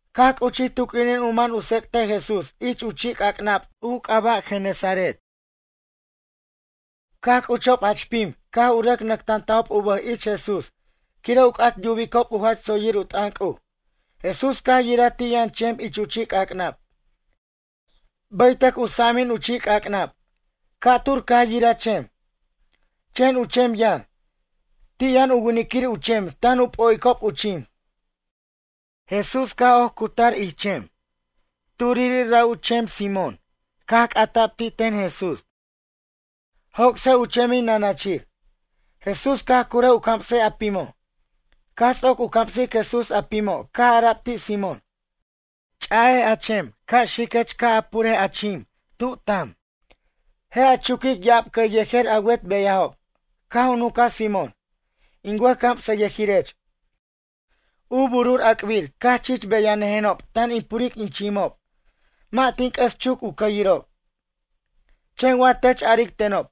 Caj c'uchij tu q'uinin u man u tsec'tej Jesús ich u chi' c'ac'nab u c'aba' Geneseret. Caj c'uchob jach pim, caj u rʌc nʌctantajob u bʌj ich Jesús quire' u c'at yubicob u jach tsoyir u t'ʌn C'uj. Jesús caj yiraj ti' yʌn chem ich chi' c'ac'nab, bʌytʌc u sa'amin u chi' c'ac'nab. Ca'tur caj yiraj chem. Chen u chem yʌn. Ti' yʌn u winiquirir u chem tan u p'o'icob u chim. Jesús caj oc cutar ich chem, turiri', ra' u chemin Simón caj c'ata'b ti' ten Jesús: ―Joc'sej u chemin nʌnʌchir. Jesús caj curʌj u camsej a pimo'. Caj ts'oc u camsic Jesús a pimo' caj ara'b ti' Simón: ―Ch'aj a chem ca' xiquech ca' a purej a chim tub tam. Je' a chuquic ya'ab cʌy yejer a wet beyajob. Caj u nunca Simón: ―In wʌjcamsʌyʌjirech, u bur u ac'bir caj chich beyanʌjenob tan in puric in chimob. Mʌ' tin c'ʌs chuc u cʌyirob. Chen wa tech aric tenob,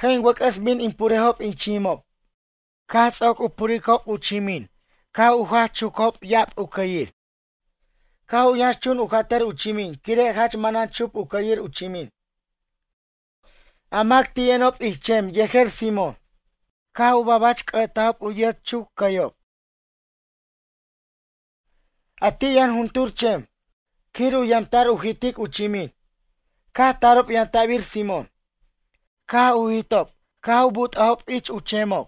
je' in wʌc'ʌs bin in purejob in chimob. Caj ts'oc u puricob u chimin caj u jach chucajob u cʌyir ya'ab. Caj u yʌnxchun u jatʌr u chimin quire' jach manan chup u cʌyir u chimin. A mac ti' yʌnob ich chem yejer Simón caj u babach c'ʌ'tajob u yet chucob cʌyob, a ti' yʌn juntur chem quir u yamta'r u jitic u chimin. Caj tarob yamtabir Simón. Caj u jitob caj u but'ajob ich chemob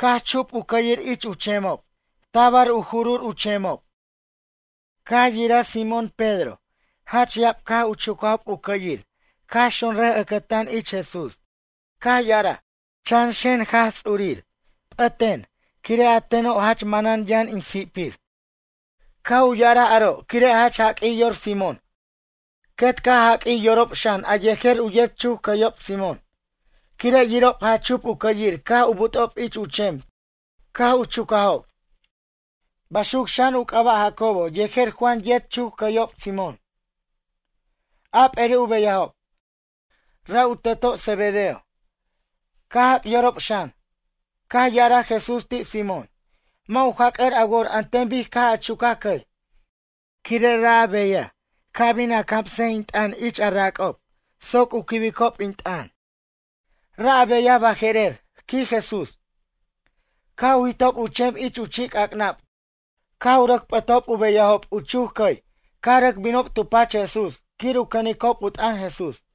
caj chup u cʌyir ich chemob tabar u jurur u chemob. Caj yiraj Simón Pedro jach ya'ab caj u chucajob u cʌyir caj xonraj ʌcʌtan ich Jesús. Caj ya'araj: ―Chan xen Jaj Ts'urir p'ʌten quire' a teno' jach manen yʌn in si'pir. Caj u ya'araj aro' quire' jach jaq'uij yor Simón. Quet caj jaq'uij yorob xan a yejer yet chuc cʌyo' Simón. Quire' yirob jach chup u cʌyir caj u but'ob ich chem caj u chucajob. Baxuc xan u c'aba' Jacobo yejer Juan yet chucob cʌy Simón, a p'eri' u beyajob. Ra' u teto' Zebedeo, caj jac' yorob xan. Caj ya'araj Jesús ti' Simón: ―Mʌ' u jac'ʌr a wor an ten bic caj a chucaj cʌy. Quire' ra' a beyaj, ca' bin a camsej in t'ʌn ich a rac'ob soc u quibicob in t'ʌn. Ra' a beyaj baje'rer ―quij Jesús. Caj u jitob u chem ich chi' c'ac'nab caj u rʌc p'ʌtob u beyajob u chuc cʌy caj rʌc binob tu pach Jesús quir u cʌnicob u t'ʌn Jesús.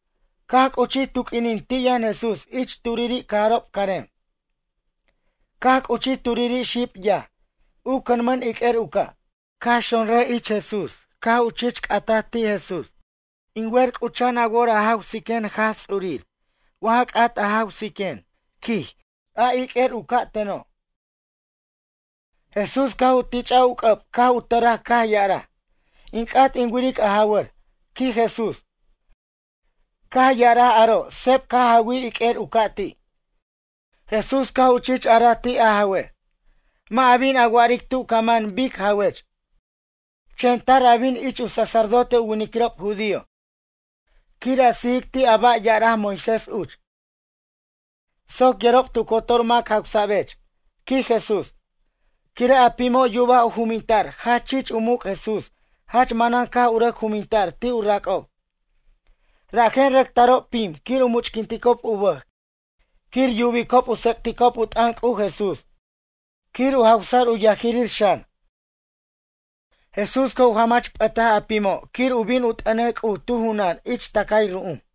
Caj c'uchi tu q'uinin ti' yʌn Jesús ich turiri' cajarob carem. Caj c'uchi turiri' xib yaj, u cʌnmʌn iq'uer u ca'. Caj xonraj ich Jesús caj u chich c'ataj ti' Jesús: ―In wer c'ucha'an a wor a jawsiquen Jaj Ts'urir wa ja c'at a jawsiquen ―quij, a iq'uer u ca' teno'. Jesús caj u tich'aj u c'ʌb caj u tʌraj caj ya'araj: ―In c'at in wiric a jawʌr ―quij Jesús. Caj ya'araj aro' seb caj jawij iq'uer u ca' ti'. Jesús caj u chich araj ti' a jawe': ―Mʌ' a bin a wa'aric tu ca man bic jawech. Chen tar a bin ich u sacerdote u winiquirob judío quir a sijic ti' a ba' ya'araj Moisés uch. Soc yerob tu cotor mac jawsa'bech ―quij Jesús. Quire' a pimo' yubaj u juminta'r jach chich u muc' Jesús, jach manan caj u rʌc juminta'r ti' u rac'ob. Rajen rʌc tarob pim quir u much'quinticob u bʌj quir yubicob u tsec'ticob u t'ʌn C'uj Jesús, quir u jawsʌr u yajirir xan. Jesús caj u jamach p'ʌtaj a pimo' quir u bin u t'ʌnej C'uj tu junan ich tʌcay ru'um.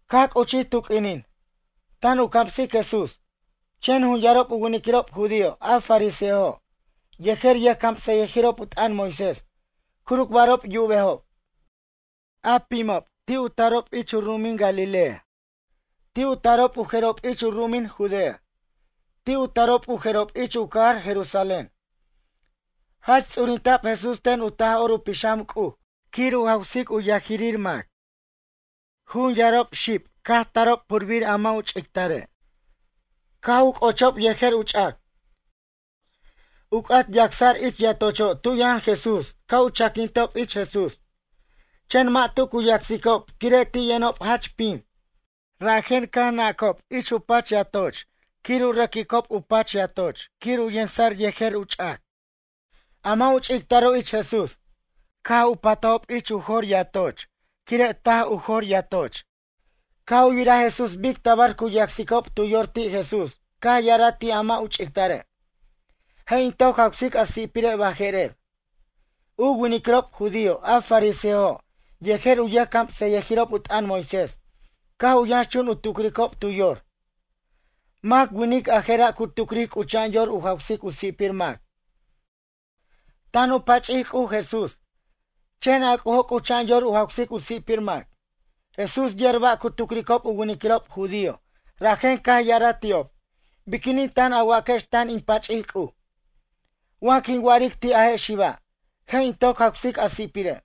Caj c'uchij tu q'uinin, tan u camsic Jesús. Chen jun yarob u winiquirob judío a fariseojo' yejer yʌjcamsʌyʌjirob u t'ʌn Moisés curucbarob yubejob. A pimob ti' u tarob ich u ru'umin Galilea. Ti' u tarob u jerob ich u ru'umin Judea. Ti' u tarob u jerob ich u cajar Jerusalén. Jach ts'urinta'b Jesús ten u Taj'or u Pixam C'uj quir u jawsic u yajirir mac. Jun yarob xib caj tarob purbir a mʌ' u ch'ictare'. Caj u c'ochob yejer u ch'ac. U c'at yacsa'r ich yatocho' tu yʌn Jesús ca' u chaquintob ich Jesús. Chen mʌ' tu cu yacsicob quire' ti' yʌnob jach pim. Rajen caj nacob ich u pach yatoch quir u rʌcob u pach yatoch quir u yensa'r yejer u ch'ac, a mʌ' u ch'ictaro' ich Jesús. Caj u patajob u jo'r yatoch quire' taj u jo'r yatoch. Caj u yiraj Jesús bic tabar cu yacsicob tu yor ti' Jesús caj ya'araj ti' a mʌ' u ch'ictare': ―Je' in toc jawsic a si'pire' baje'rer. U winiquirob judío a fariseojo' yejer u yʌjcamsʌyʌjirob u t'ʌn Moisés caj u yʌnxchun u tucricob tu yor: “Mac winic a je'ra' cu tucric c'ucha'an yor u jawsic u si'pir mac? Tan u pach'ic C'uj Jesús, chen a C'ujo' c'ucha'an yor u jawsic u si'pir mac.” Jesús yer ba' cu tucricob u winiquirob judío rajen caj ya'araj ti'ob: ―Biquinin tan a waquex tan in pach'ic C'uj? Wa quin wa'aric ti' a je' xiba': “Je' in toc jawsic a si'pire'”,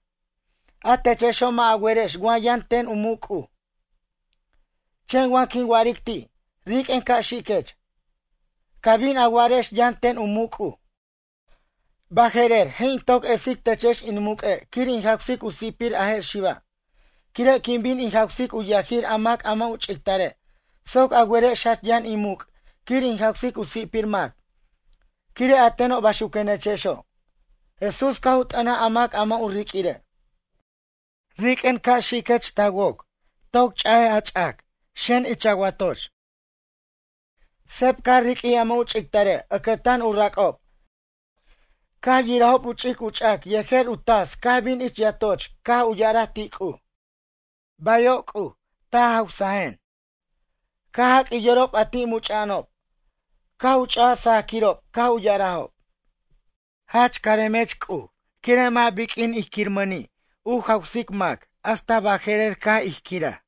a techexo' mʌ' a werex wa yʌn ten u muc' C'uj, chen wa quin wa'aric ti': “Riq'uen ca' xiquech”, ca bin a werex yʌn ten u muc' C'uj. Baje'rer je' in toc esic techex in muq'ue' quir in jawsic u si'pir a je' xiba', quire' quin bin in jawsic u yajir a mac mʌ' u ch'ictare' soc a werex jach yʌn in muc' quir in jawsic u si'pir mac, quire' a teno' baxuquenechexo'. Jesús caj u t'ʌnaj a mac a mʌ' u riq'uire': ―Riq'uen ca' xiquech ta woc, toc ch'aj a ch'ac, xen ich a watoch. Seb caj riq'uij a mʌ' u ch'ictare' ʌcʌtan u rac'ob caj yirajob u ch'ic u ch'ac yejer u tas caj bin ich yatoch caj u ya'araj ti' C'uj: ―Bayo' C'uj, ta jawsajen. Caj jaq'uij yorob a ti' much'a'anob, caj u ch'aj sajaquirob caj u ya'arajob: ―Jach caremech C'uj quire' mʌ' biq'uin ij quiramʌni' u jawsic mac hasta baje'rer caj ij quiraj.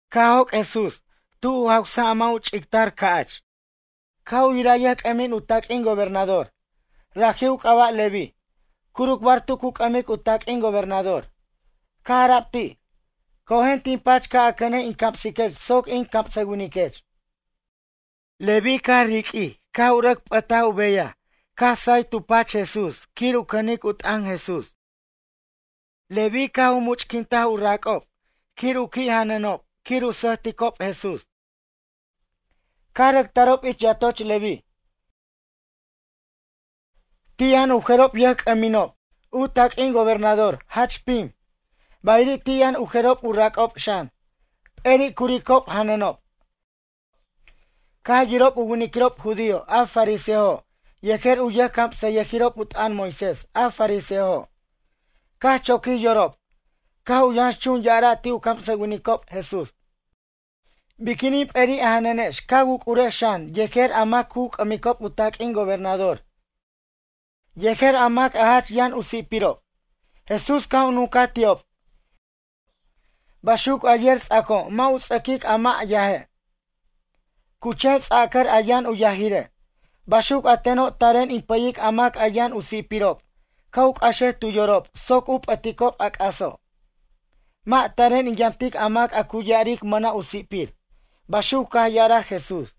Caj joc' Jesús tub u jawsaj a mʌ' u ch'ictar ca'ch. Caj u yiraj yʌjc'ʌmin u taq'uin gobernador, raji' u c'aba' Leví, curucbar tu cu c'ʌmic u taq'uin gobernador. Caj ara'b ti': ―Cojen tin pach ca' a cʌnej in camsiquech soc in camsʌwiniquech. Leví, caj riq'uij caj u rʌc p'ʌtaj u beyaj caj say tu pach Jesús quir u cʌnic u t'ʌn Jesús. Leví, caj u much'quintaj u rac'ob quir u qui' janʌnob quir u sʌjticob Jesús. Caj rʌc tarob ich yatoch Leví, ti' yʌn u jerob yʌjc'ʌminob, u taq'uin gobernador jach pim. Bayiri' ti' yʌn u jerob u rac'ob xan. P'eri' curicob janʌnob. Caj yirob u winiquirob judío a fariseojo' yejer u yʌjcamsʌyʌjirob u t'ʌn Moisés a fariseojo'. Caj choquij yorob, caj u yʌnxchun ya'ara' ti' u camsʌwinicob Jesús: ―Biquinin p'eri' a janʌnex ca wuc'urex xan yejer a mac cu c'ʌmicob u taq'uin gobernador yejer a mac jach yʌn u si'pirob? Jesús caj u nuncaj ti'ob: ―Baxuc a yer ts'aco' mʌ' u ts'ʌquic a mʌ' yaje', cu chen ts'acʌr a yʌn u yajire'. Baxuc a teno' taren in pʌyic a mac a yʌn u si'pirob ca' u c'axej tu yorob soc u p'ʌticob a c'aso'. Mʌ' taren in yamtic a mac cu ya'aric mʌna' u si'pir ―baxuc caj ya'araj Jesús.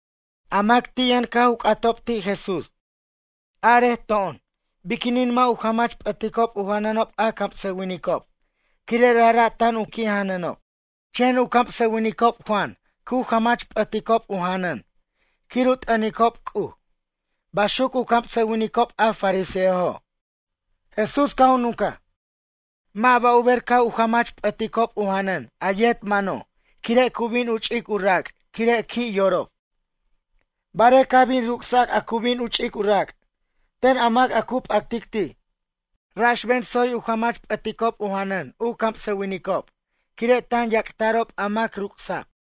A mac ti' yʌn caj u c'atob ti' Jesús: ―Arej to'on biquinin mʌ' u jamach p'ʌticob u janʌnob a camsʌwiniquirob quire' rajra' tan u qui' janʌnob. Chen u camsʌwinicob Juan cu jamach p'ʌticob u janʌn, quir u t'ʌnicob C'uj ―baxuc u camsʌwinicob a fariseojo'. Jesús caj u nuncaj: ―Mʌ' ba' u ber ca' u jamach p'ʌticob u janʌn a yet mano' cu bin u ch'ic u rac' quire' qui' yorob. Barej ca' bin ruc'sac a cu bin u ch'ic u rac' ten a mac a cu p'actic ti'. Raxben tsoy u jamach p'ʌticob u janʌn u camsʌwinicob quire' tan yac'ta'rob a mac ruc'sa'b.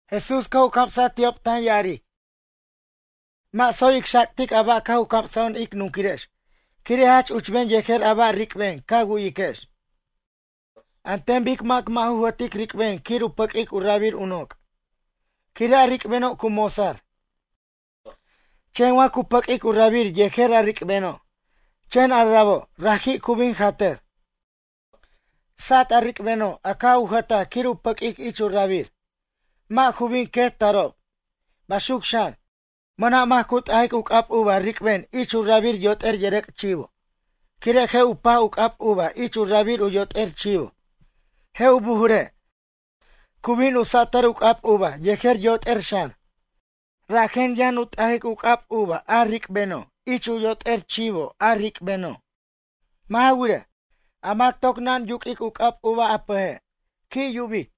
Jesús caj u camsaj ti'ob tan ya'aric: ―Mʌ' tsoy ic xac'tic a ba' caj u camsajo'on ic nunquirex quire' jach uchben yejer a ba' ric'ben ca wu'yiquex. An ten bic mac mʌ' ju jʌtic ric'ben quir u pʌq'uic u rabir u noc'. Quire' a ric'beno' cu mosar. Chen wa cu pʌq'uic u rabir yejer a ric'beno', chen a rabo', raji' cu bin jatʌr. Sat a ric'beno' a caj u jʌtaj quir u pʌq'uic ich u rabir. Mʌ' ju bin quet tarob. Baxuc xan, mʌna' mac cu t'ajic u c'ab uva ric'ben ich u rabir yot'er yʌrʌc' chivo, quire' je' u paj u c'ab uva ich u rabir u yot'er chivo, je' u bujure', cu bin u satʌr u c'ab uva yejer yot'er xan. Rajen yʌn u t'ajic u c'ab uva a ric'beno' ich u yot'er chivo a ric'beno'. Mʌ' ja wirej, a mac toc naj yuq'uic u c'ab uva a pʌje', qui' yubic.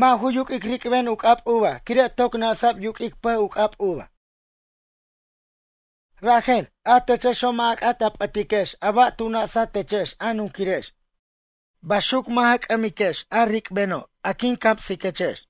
Mʌ' ju yuq'uic ric'ben u c'ab uva quire' toc na'sa'b yuq'uic pʌj u c'ab uva. Rajen, a techexo' mʌ' a c'at a p'ʌtiquex a ba' tu na'satechex a nunquirex. Baxuc mʌ' ja c'ʌmiquex a ric'beno' quin camsiquechex.